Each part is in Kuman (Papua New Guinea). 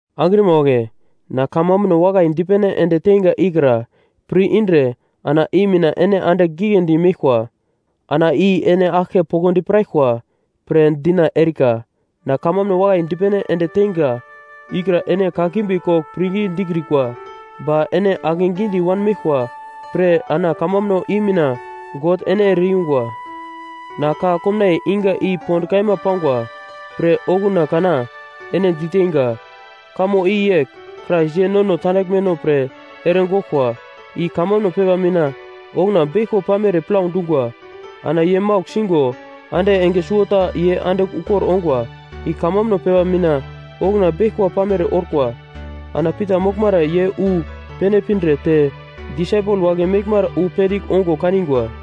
Angrima wagle, na kamambuno wakai dipene ende teinga ikra pir-indre ana i mina ene andigl giglendi meglkwa, ana i ene aglke poglodi piraglkwa pre dina erika. Na kamambuno wakai dipene ende teinga ikra ene kakimbi kogl pirngi dikrikwa, ba ene akegidi wanmeglkwa pre ana kamambuno i mina God ene ere-yungwa. Na ka komnaiye iga i pond kaima pangwa pre okuna kana ene diteinga. Kamo i yegl: Krais ye nono tandaglmeno pre ere goglkwa, i kamambuno pepa mina okuna beglko pamere plau dungwa. Ana ye maugl sigo ande enge suwota ye andigl ukor ongwa, i kamambuno pepa mina okuna beglko pamere orkwa. Ana Pita moglmara ye wu pene pindre te disaipel wagle meglmara wu pendigl ongo kanigwa,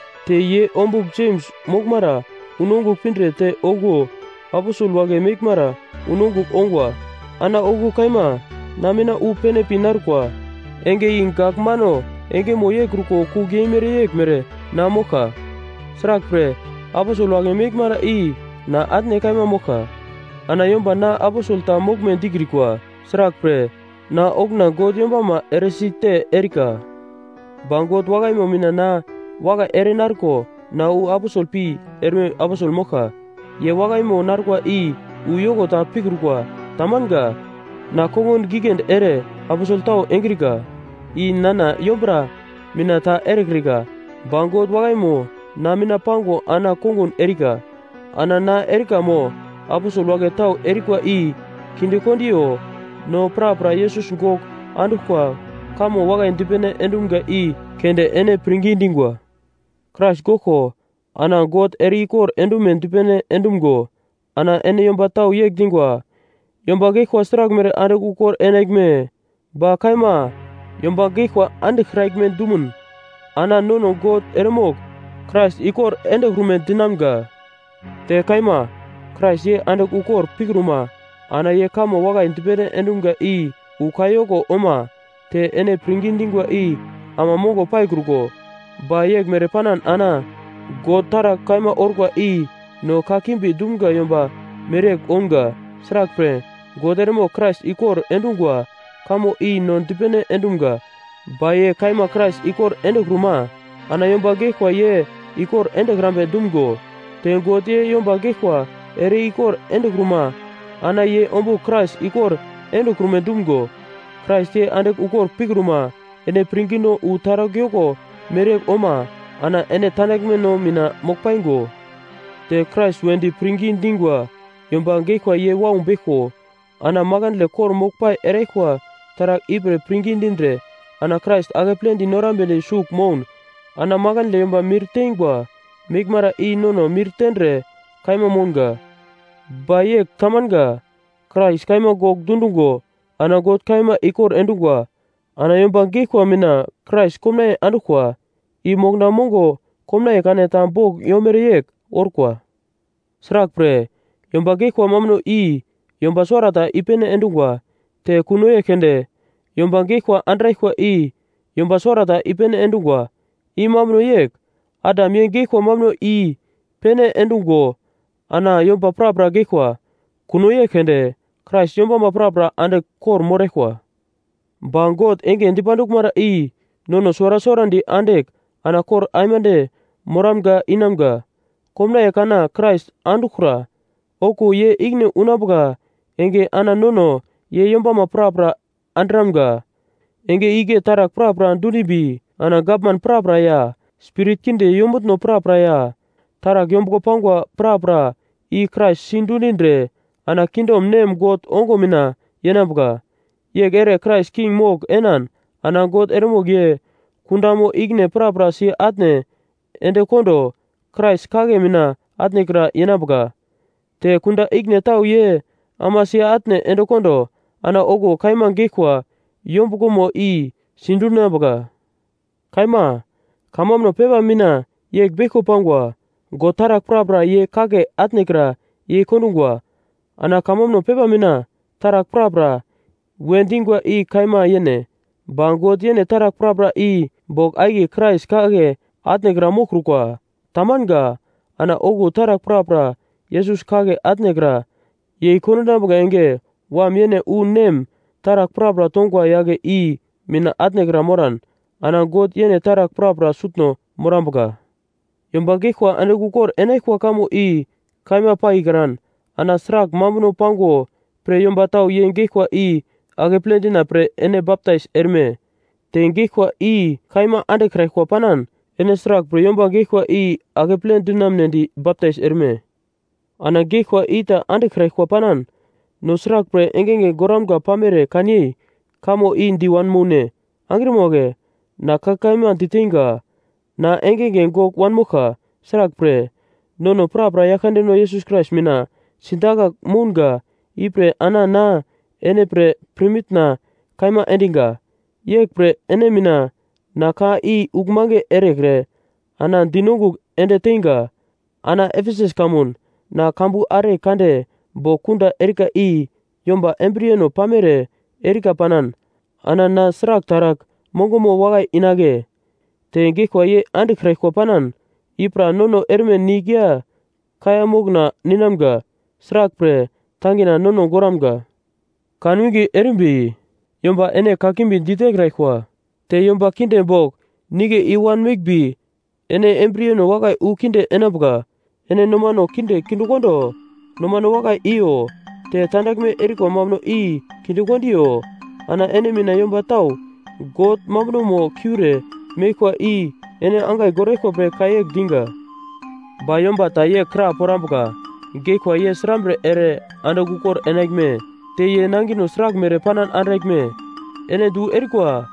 Te ye ombugl Jems moglmara unongugl pindre te okuwo aposel wagle meglmara unongugl ongwa, ana okuwo kaima na mina wu pene pi narkwa. Enge i gak mano engeno yeikruko kugl yeimere yeglmere na moglka. Sraglpre, aposel wagle meglmara i na atne kaima moglka, ana yomba na aposel ta moglme dikrikwa. Sraglpre, na okuna God yombama eresi te erika. Ba God wakaimo mina na wakai ere narko na wu aposel pi erme aposel moglka. Ye wakaimo narkwa i wu yoko ta pikrukwa. Tamanga. Na kongun giglendi ere aposel tau engrika. I nana yombura mina ta erekrika, ba God wakaimo na mina pango ana kongun erika. Ana na erika mo aposel wagle tau erikwa i kindekondiyo, no prapra Yesus gogl anduglkwa kamo wakai dipene endumga i keunde ene pirngi dingwa. Krais goglko ana God ere-ikor endume dipene endumgo ana ene yomba tau yegl dingwa, “Yomba geglkwa sraglmere andigl ukor enaglme?” Ba kaima, yomba geglkwa andiglkraglme dumun, ana nono God eremogl Krais ikor endekrume dinamga. Te kaima, Krais ye andigl ukor pikruma ana ye kamo wakai dipene endumga i wu kayoko oma te ene pirngi dingwa i ama mongo paikruko. Ba yeglmere panan ana God taragl kaima orkwa i no kakimbi dumga yomba mereyegl ounga. Sraglpre, God eremogl Krais ikor endungwa kamo i no dipene endumga, ba ye kaima Krais ikor endekruma ana yomba geglkwa ye ikor endekrambe dumgo. Te God ye yomba geglkwa ere-ikor endekruma, ana ye ombugl Krais ikor endekrume dumgo. Krais ye andigl ukor pikruma, ene pirngino wu taragl yoko mereyegl oma ana ene tandaglmeno mina mogl paingo. Te Krais wedi pirngi dingwa yomba geglkwa ye wau beglko. Ana makandle kor-moglpai eraglkwa taragl ipre pirngi dindre ana Krais akepledi norambedi sugl moun, ana makandle yomba mir tengwa meglmara i nono mir tendre kaima mounga. Ba yegl tamanga, Krais kaima gogl dundungo ana God kaima ikor endungwa. Ana yomba geglkwa mina Krais komnaiye anduglkwa, i mokna mongo komnaiye kana ta bogl yomere yegl orkwa. Sraglpre, yomba geglkwa mambuno i yomba suwarata i-pene endungwa, te kuno yegl keunde yomba geglkwa andraglkwa i yomba suwarata i-pene endungwa. I mambuno yegl: Adam ye geglkwa mambuno i-pene endungo ana yomba prapra geglkwa. Kuno yegl keunde Krais yombama prapra andigl kor-moraglkwa. Ba God enge dipanduglmara i nono suwara suwarandi andigl ana kor aimande moramga inamga. Komnaiye kana Krais anduglkra, okuwo ye ikine unambuka enge ana nono ye yombama prapra undiramga. Enge igle taragl prapra dundimbi, ana gavman prapra ya, spirit kinde yombutno prapra ya taragl yombuglo pangwa prapra i Krais sidundindre ana kingdom Nem God ongo mina yenambuka. Yegl ere Krais king mogl enan ana God eremogl ye kundamo ikine prapra si-atne endekondo Krais kagle mina atnekra yenambuka. Te kunda ikine tau ye ama si-atne endekondo ana okuwo kaima geglkwa yombuglomo i sidundinambuka. Kaima, kamambuno pepa mina yegl beglko pangwa, “God taragl prapra ye kagle atnekra yei kondungwa.” Ana kamambuno pepa mina “Taragl prapra” we dingwa i kaima yene. Ba God yene taragl prapra i bogl akiye Krais kagle atnekra moglkrukwa, tamanga. Ana okuwo taragl prapra Yesus kagle atnekra yei kondinambuka enge Wam yene wu Nem taragl prapra tongwa yagle i mina atnekra moran ana God yene taragl prapra sutno morambuka. Yomba geglkwa andigl ukor enaglkwa kamo i kaima paikran, ana sragl mambuno pango pre yomba tau ye geglkwa i akeple dina pre ene baptais erme? Te geglkwa i kaima andiglkraglkwa panan ene sraglpre yomba gaglkwa i akeple dinamunedi baptais erme? Ana geglkwa i ta andiglkraglkwa panan, no sraglpre engenge goramga pamere kanyei kamo i di wanmoune? Angrima wagle, na ka kaima diteinga. Na engenge gogl wanmoglka! Sraglpre, nono prapra Yaglkandeno Yesus Krais mina sidakagl mounga ipre ana na ene pre pirmitna kaima endiga, yeglpre ene mina na ka i uglmange erekre ana dinongugl ende teinga. Ana Efesus kamun na kambu are kande bogl kunda erika i yomba embriyeno pamere erika panan, ana na sragl taragl mongomo wakai inagle? Te geglkwa ye andiglkraglkwa panan, “I pra nono erme nigl ya kaiya mokna ninamga. Sraglpre, tangina nono goramga.” Kanwinge erimbi yomba ene kakimbi ditekraglkwa. Te yomba kinde bogl nigle i-wan meglmbi ene embriyeno wakai wu kinde enambuka. Ene nomano kinde kindekondo nomano wakai iyo, te tandaglme erikwa mambuno i kindekondiyo. Ana ene mina yomba tau God mambunomo kiure meglkwa i ene angai goraglkwa pre ka yegl diga. Ba yomba ta yegl kra porambuka, “Geglkwa ye srambre ere andigl ukor enaglme? Te ye nangino sraglmere panan andraglme?” Ene du erikwa!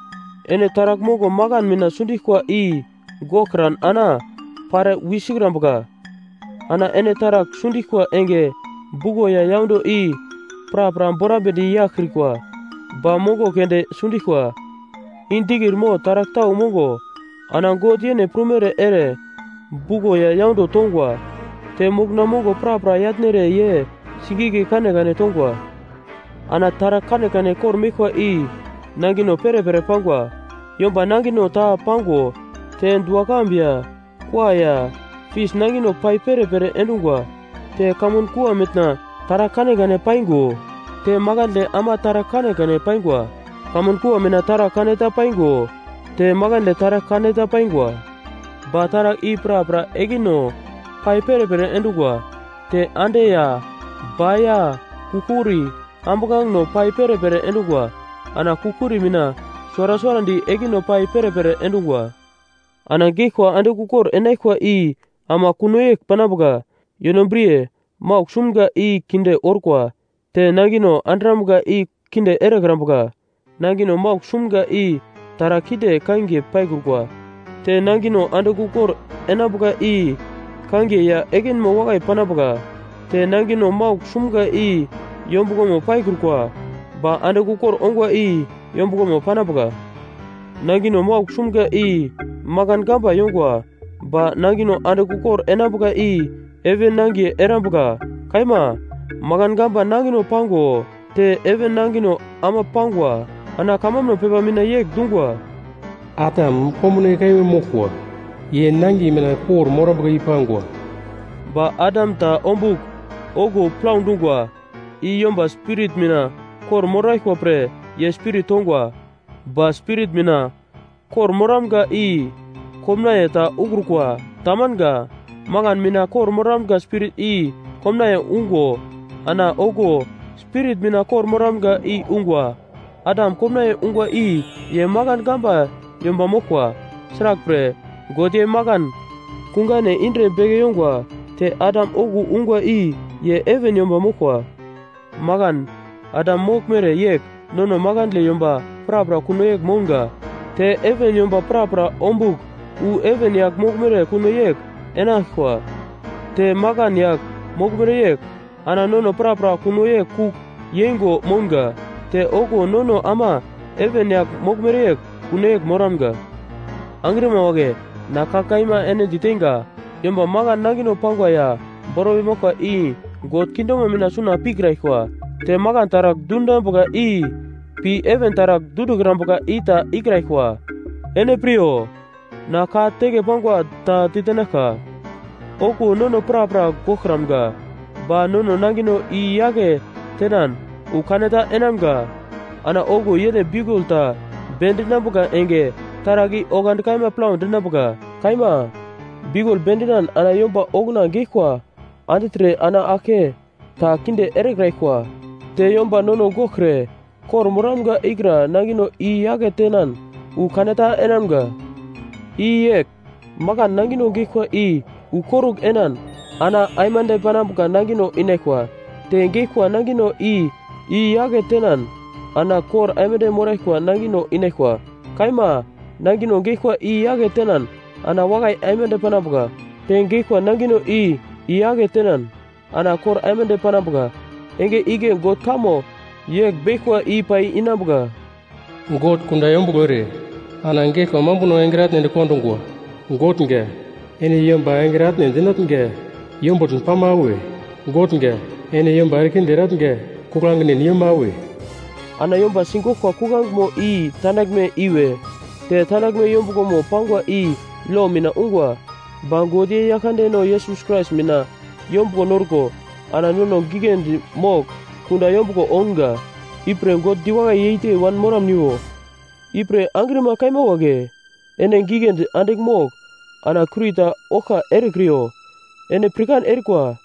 Ene taragl mongo akan mina sundiglkwa i goglkran ana pare wisikrambuka. Ana ene taragl sundiglkwa enge, buglo ya yaundo i prapra borambedi yaglkrikwa, ba mongo keunde sundiglkwa; i dikir mo taragl tau mongo. Ana God yene prumere ere buglo ya yaundo tongwa, te mokna mongo prapra yatnere ye singigle kanekane tongwa. Ana taragl kanekane kor-meglkwa i nangino perepere pangwa. Yomba nangino ta pango te dua-kambu ya kua ya fis nangino pai perepere endungwa. Te kamun kua mitna taragl kanekane paingo te makandle ama taragl kanekane paingwa. Kamun kua mina taragl kaneta paingo te makandle taragl kaneta paingwa. Ba taragl i prapra ekino pai perepere endungwa. Te ande ya ba ya kugl-kuri ambuglangeno pai perepere endungwa. Ana kugl-kuri mina suwara suwarandi ekino pai perepere endungwa. Ana geglkwa andigl ukor enaglkwa i ama kuno yegl panambuka. Yonobriye maugl sumga i kinde orkwa. Te nangino andrambuka i kinde erekrambuka. Nangino maugl sumga i taragl kinde kangiye paikrukwa. Te nangino andigl ukor enambuka i kangiye ya ekinmo wakai panambuka. Te nangino maugl sumga i yombuglomo paikrukwa, ba andigl ukor ongwa i yombuglomo panambuka. Nangino maugl sumga i makan gamba yongwa. Ba nangino andigl ukor enambuka i heven nangiye erambuka. Kaima, makan gamba nangino pango te heven nangino ama pangwa. Ana kamambuno pepa mina yegl dungwa, “Adam komnaiye kaima moglkwa. Ye nangiye mina kor-morambuka i pangwa.” Ba Adam ta ombugl okuwo plau dungwa, i yomba spirit mina kor-moraglkwa pre ye spirit tongwa. Ba spirit mina kor-moramga i komnaiye ta ukrukwa. Tamanga. Makan mina kor-moramga spirit i komnaiye ungo, ana okuwo spirit mina kor-moramga i ungwa. Adam komnaiye ungwa i ye makan gamba yomba moglkwa. Sraglpre, God ye makan kungane indre beke yongwa. Te Adam okuwo ungwa i ye heven yomba moglkwa. Makan Adam moglmere yegl nono makandle yomba prapra kuno yegl mounga. Te heven yomba prapra ombugl wu heven yagl moglmere kuno yegl enaglkwa. Te makan yagl moglmere yegl ana nono prapra kuno yegl kugl yeingo mounga. Te okuwo nono ama heven yagl moglmere kuno yegl moramga. Angrima wagle, na ka kaima ene diteinga, yomba makan nangino pangwa ya bormai moglkwa i God kingdomo mina suna pikraglkwa. Te makan taragl dundinambuka i pi heven taragl dundikrambuka i ta ikraglkwa. Ene piryo, na ka teke pangwa ta ditenaglka: Okuwo nono prapra goglkramga ba nono nangino i-yake tenan wu kaneta enamga. Ana okuwo yene biukul ta bendinambuka enge taragl i oglandi kaima plau dinambuka. Kaima, biukul bendinan ana yomba okuna geglkwa andigltre ana aglke ta kinde erekraglkwa. Te yomba nono goglkre kor-moramga ikra nangino i-yake tenan wu kaneta enamga. I yegl: Makan nangino geglkwa i wu korugl enan ana aimande panambuka nangino inaglkwa. Te geglkwa nangino i i-yake tenan ana kor aimande moraglkwa nangino inaglkwa. Kaima, nangino geglkwa i i-yake tenan ana wakai aimande panambuka. Te geglkwa nangino i i-yake tenan ana kor aimande panambuka. Enge igle God kamo yegl beglkwa i pai inambuka: “God kunda yombuglo ere ana geglkwa mambuno engre atne endekondungwa.” “Gotnga, ene yomba engre atne endinatnga yombutn pama awe? Gotnga, ene yomba erekinde eratnga kuglangin yoma-awe?” Ana yomba sigoglkwa kuglangemo i tandaglme iwe. Te tandaglme yombuglomo pangwa i lo mina yungwa. Ba God ye Yaglkandeno Yesus Krais mina yombuglo norko ana nono giglendi mogl kunda yombuglo ounga. Ipre God diwakai yeite wan moramniwo. Ipre angrima kaima wagle, ene giglendi andigl mogl ana kurita oglka erekriyo. Ene pirkan erikwa,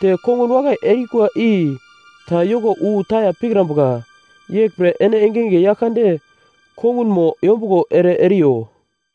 te kongun wakai erikwa i ta yoko wu taya pikrambuka. Yeglpre ene engenge Yaglkande kongunmo yombuglo ere eriyo.